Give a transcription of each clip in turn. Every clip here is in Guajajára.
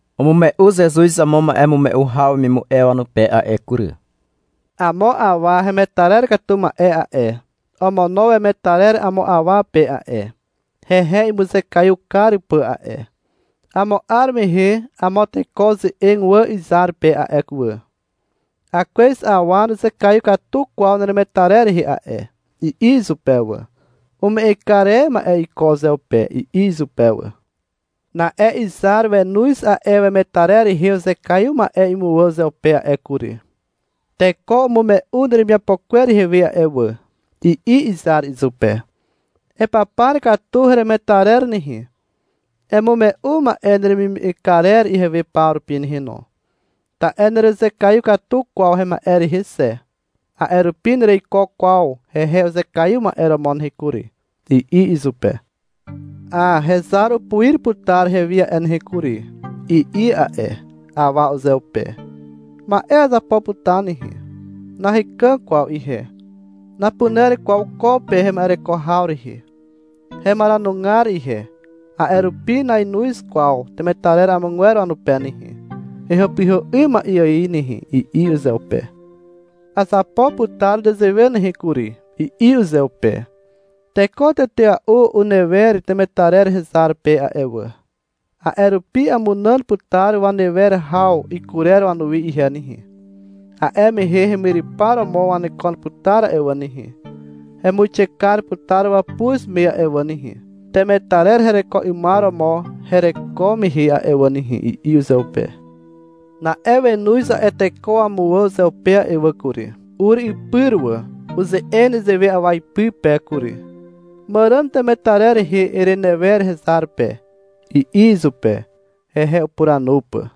Umume'u Zezuz amo ma'emume'u haw wemimu'e wanupe a'e kury. — Amo awa hemetarer katu ma'e a'e, omono wemetarer amo awa pe a'e, hehe imuzekaiw kar pà a'e. Amo 'ar mehe amo teko uze'eg wà izar pe a'e wà. — Akwez awa nuzekaiw katu kwaw neremetarer rehe a'e, i'i izupe wà. Ume'eg kar e ma'e iko uzeupe, i'i izupe wà. Na'e izar wenoz a'e wemetarer rehe uzekaiw ma'e imuwà uzeupe a'e kury. — Teko umume'u neremiapo kwer ihewe a'e wà, i'i izar izupe. Epapar katu heremetarer nehe. Emume'u ma'e neremime'eg karer ihewe paw rupi nehe no. Ta'e nerezekaiw katu kwaw hema'e rehe xe, a'e rupi nereiko kwaw hehe uzekaiw ma'e romo nehe kury, i'i izupe. Hà, hezar upuir putar hewi a'e nehe kury, i'i a'e awa uzeupe. — Ma'e azapo putar nehe. Nahekàg kwaw ihe, napuner kwaw ko pe hema'ereko haw rehe. Hemaranugar ihe, a'e rupi nainoz kwaw temetarer amogwer wanupe nehe, hehàpyhà 'ym ma'e ài nehe, i'i uzeupe. Azapo putar nezewe nehe kury, i'i uzeupe. — Teko tetea'u unewer temetarer hezar pe a'e wà. A'e rupi amunàn putar wanewer haw ikurer wanuwi ihe nehe, a'e mehe hemyrypar romo wanekon putar a'e wà nehe, hemuixe kar putar wàpuz me a'e wà nehe, temetarer hereko 'ymar romo hereko mehe a'e wà nehe, i'i uzeupe. Na'e wenoz a'e teko wamuwà uzeupe a'e wà kury. Ur ipyr wà. Uze'eg nezewe awa ipy pe kury. — Màràn temetarer rehe erenewer hezar pe, i'i izupe hehe upuranu pà.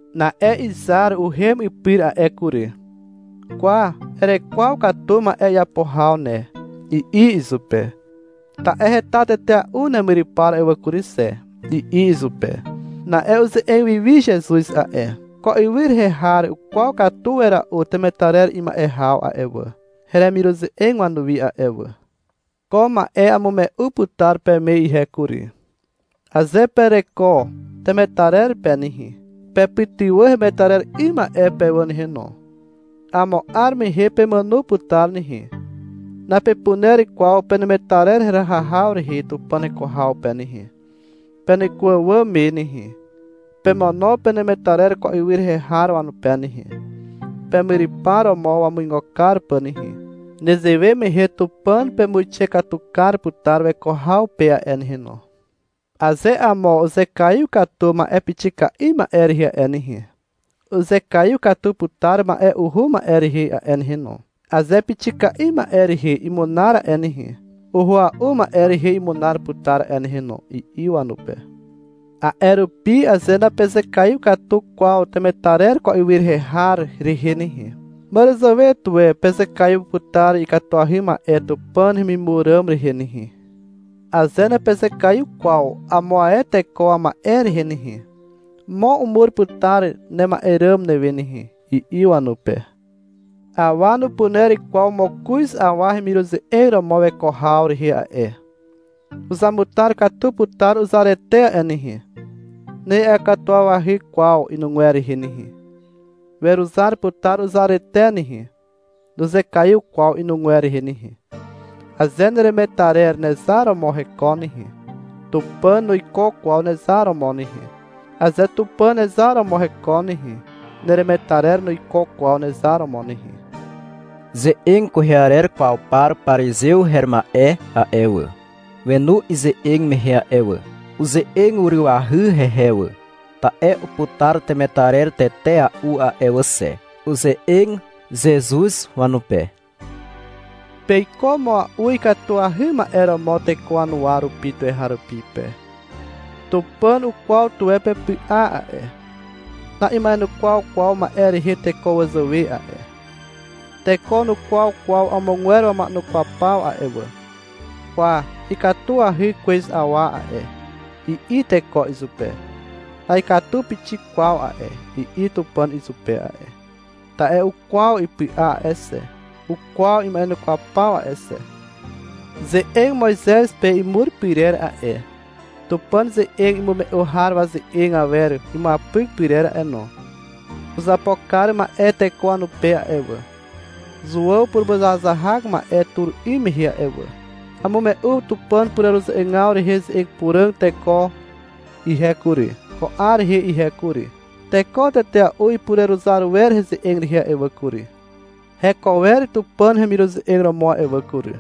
Na'e izar uhem ipyr a'e kury. Kwa, erekwaw katu ma'e iapo haw ne, i'i izupe. Ta'e heta tetea'u nemyrypar a'e wà kury xe, i'i izupe. Na'e uze'eg wi wi Zezuz a'e. — Ko ywy rehe har ukwaw katu wera'u temetarer ima'e haw a'e wà, heremiruze'eg wanuwi a'e wà. Ko ma'e amume'u putar peme ihe kury. Aze pereko temetarer pe nehe, pepytywà hemetarer 'ym ma'e pe wà nehe no. Amo 'ar mehe pemàno putar nehe. Napepuner kwaw penemetarer heraha haw rehe Tupàn heko haw pe nehe, peneko àwàm me nehe. Pemono penemetarer ko ywy rehe har wanupe nehe, pemyrypar romo wamuigo kar pà nehe. Nezewe mehe Tupàn pemuixe katu kar putar weko haw pe a'e nehe no. Aze amo uzekaiw katu ma'e pixika'i ma'e rehe a'e nehe, uzekaiw katu putar ma'e uhua'u ma'e rehe a'e nehe no. Aze pixika'i ma'e rehe imunar a'e nehe, uhua'u ma'e rehe imunar putar a'e nehe no, i'i wanupe. A'e rupi aze napezekaiw katu kwaw temetarer ko ywy rehe har rehe nehe, màràzàwe tuwe pezekaiw putar ikatuahy ma'e Tupàn hemimur ràm rehe nehe. Aze napezekaiw kwaw amo ae teko wama'e rehe nehe, mo umur putar nema'e ràm newe nehe, i'i wanupe. Awa nupuner kwaw mokoz awa hemiruze'eg romo weko haw rehe a'e. Uzamutar katu putar uzarete a'e nehe. Na'iakatuwawahy kwaw inugwer rehe nehe. Weruzar putar uzarete nehe, nuzekaiw kwaw inugwer rehe nehe. Aze neremetarer nezar romo hekon nehe, Tupàn nuiko kwaw nezar romo nehe. Aze Tupàn nezar romo hekon nehe, neremetarer nuiko kwaw nezar romo nehe. Ze'eg kwehe arer kwaw par parizew her ma'e a'e wà, wenu ize'eg mehe a'e wà. Uze'eg urywahy hehe wà, ta'e uputar temetarer tetea'u a'e wà xe. Uze'eg Zezuz wanupe. — Peiko mua'u ikatuahy ma'e romo teko wanuwa rupi tuweharupi pe. Tupàn ukwaw tuwe pepy'a a'e. Na'ima'enukwaw kwaw ma'e rehe teko wazàwe a'e. Teko nukwaw kwaw amogwer wama'enukwaw paw a'e wà. — Kwa, ikatuahy kwez awa a'e, i'i teko izupe. — Na'ikatu pixik kwaw a'e, i'i Tupàn izupe a'e, ta'e ukwaw ipy'a a'e xe, ukwaw ima'enukwaw paw a'e xe. Ze'eg Moizez pe imur pyrer a'e, Tupàn ze'eg imume'u har waze'eg awer imuapyk pyrer a'e no, uzapo kar ma'e teko wanupe a'e wà, Zuàw purumuzahazahak ma'e tur 'ym mehe a'e wà. Amume'u Tupàn pureruze'egaw rehe ze'eg puràg teko ihe kury, ko 'ar rehe ihe kury. Teko tetea'u ipureruzar wer heze'eg rehe a'e wà kury. Heko wer Tupàn hemiruze'eg romo a'e wà kury.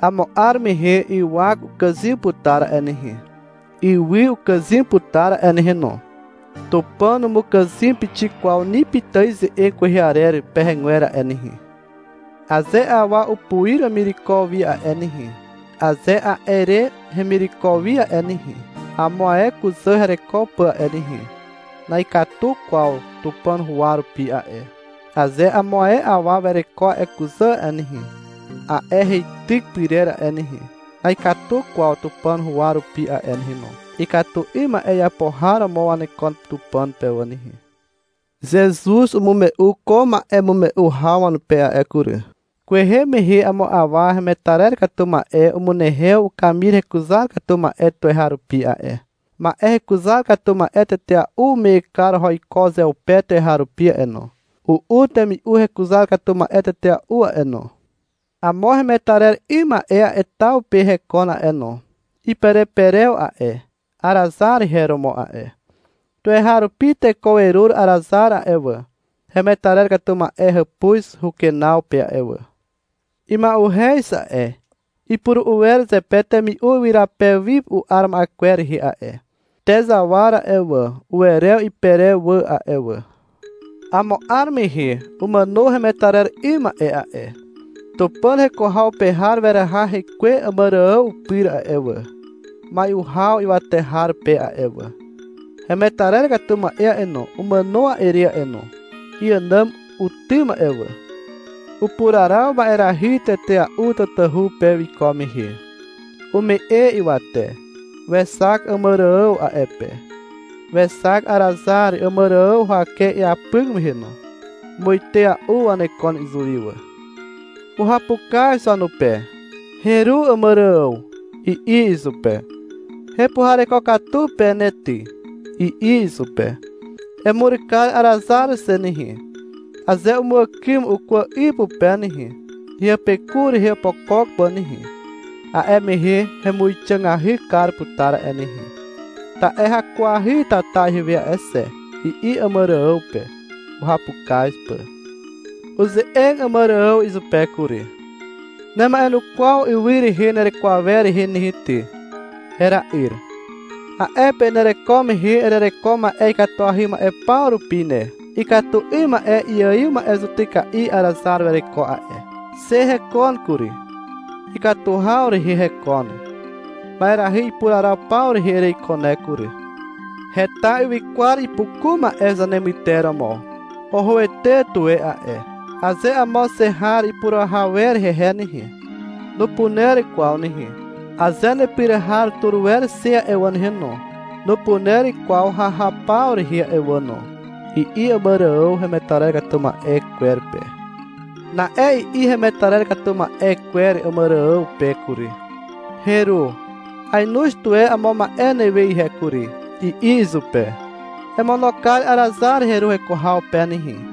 Amo 'ar mehe ywak ukàzym putar a'e nehe, ywy ukàzym putar a'e nehe no. Tupàn numukàzym pixik kwaw ni pitài ze'eg kwehe arer pehegwer a'e nehe. Aze awa upuir wemireko wi a'e nehe, aze a'e re hemireko wi a'e nehe, amo ae kuzà hereko pà a'e nehe, na'ikatu kwaw Tupàn huwa rupi a'e. Aze amo ae awa wereko a'e kuzà a'e nehe, a'e heityk pyrer a'e nehe, na'ikatu kwaw Tupàn huwa rupi a'e nehe no. Ikatu 'ym ma'e iapo har romo wanekon Tupàn pe wà nehe. Zezuz umume'u ko ma'emume'u haw wanupe a'e kury. — Kwehe mehe amo awa hemetarer katu ma'e umunehew ukamir hekuzar katu ma'e tuweharupi a'e. Ma'e hekuzar katu ma'e tetea'u ume'eg kar oho iko uzeupe tuweharupi a'e no. U'u temi'u hekuzar katu ma'e tetea'u a'e no. Amo hemetarer 'ym ma'e a'e taw pe hekon a'e no. Ipereperew a'e. Arazar her romo a'e. Tuweharupi teko werur Arazar a'e wà, hemetarer katu ma'e hàpuz hukenaw pe a'e wà. Ima'uhez a'e. Ipuru'u wer zepe temi'u ywyrapew wi u'ar ma'e kwer rehe a'e. Te zawar a'e wà, uwerew iperew wà a'e wà. Amo 'ar mehe umàno hemetarer 'ym ma'e a'e. Tupàn heko haw pe har weraha hekwe Àmàrààw pyr a'e wà, mai'u haw ywate har pe a'e wà. Hemetarer katu ma'e a'e no, umàno a'e re a'e no. Iànàm utym a'e wà. Upuraraw ma'erahy tetea'u tatahu pe wiko mehe. Ume'e ywate. Wexak Àmàrààw a'e pe. Wexak Arazar Àmàrààw huwake iapyk mehe no. Muite a'u wanekon izuwi wà. Uhapukaz wanupe. — Heru Àmàrààw, i'i izupe. — Hepuhareko katu pe ne ty, i'i izupe. — Emur kar Arazar xe nehe. Aze umuàkym ukwà 'y pupe nehe, heapeku rehe opokok pà nehe, a'e mehe hemuixàgahy kar putar a'e nehe. Ta'e hakuahy tata ihewe a'e xe, i'i Àmàrààw pe, uhapukaz pà. Uze'eg Àmàrààw izupe kury. — Nema'enukwaw ywy rehe nereko awer rehe nehe ty, hera'yr. A'e pe nereko mehe erereko ma'e ikatuahy ma'e paw rupi ne. Ikatu 'ym ma'e iaiw ma'e zutyka'i Arazar wereko a'e. Xe hekon kury, ikatu haw rehe hekon. Ma'erahy ipuraraw paw rehe ereiko ne kury. Heta ywykwar ipuku ma'e zanemyter romo. Ohoete tuwe a'e. Aze amo xe har ipurahaw wer hehe nehe, nupuner kwaw nehe. Aze nepyr har tur wer xe a'e wà no, nupuner kwaw hahaw paw rehe a'e wà no, i'i Àmàrààw hemetarer katu ma'e kwer pe. Na'e i'i hemetarer katu ma'e kwer Àmàrààw pe kury. — Heru, ainoz tuwe amo ma'e newe ihe kury, i'i izupe. — Emono kar Arazar heru heko haw pe nehe,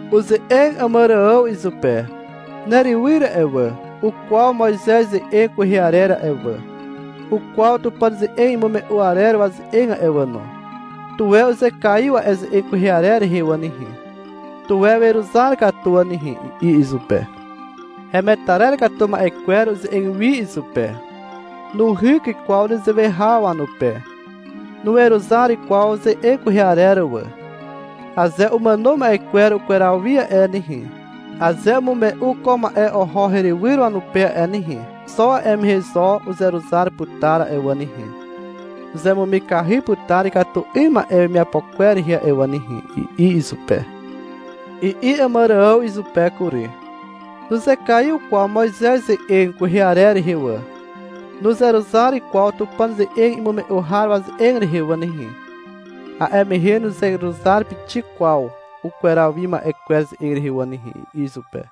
Uze'eg Àmàrààw izupe. — Nerywyr a'e wà, ukwaw Moizez ze'eg kwehe arer a'e wà. Ukwaw Tupàn ze'eg imume'u arer waze'eg a'e wà no. Tuwe uzekaiw a'e ze'eg kwehe arer rehe wà nehe, tuwe weruzar katu wà nehe, i'i izupe. Hemetarer katu ma'e kwer uze'eg wi izupe. — Nuhyk kwaw nezewe haw wanupe. (Nuweruzar kwaw ze'eg kwehe arer wà.) Aze umàno ma'e kwer ukweraw wi a'e nehe, aze umume'u ko ma'e oho herywyr wanupe a'e nehe, xo a'e mehe zo uzeruzar putar a'e wà nehe. Uzemumikahy putar ikatu 'ym ma'e wemiapo kwer rehe a'e wà nehe, i'i izupe. I'i Àmàrààw izupe kury. — Nuzekaiw kwaw Moizez ze'eg kwehe arer rehe wà, nuzeruzar kwaw Tupàn ze'eg imume'u har waze'eg rehe wà nehe, a'e mehe nuzeruzar pixik kwaw ukweraw wi ma'e kwer ze'eg rehe wà nehe, i'i izupe.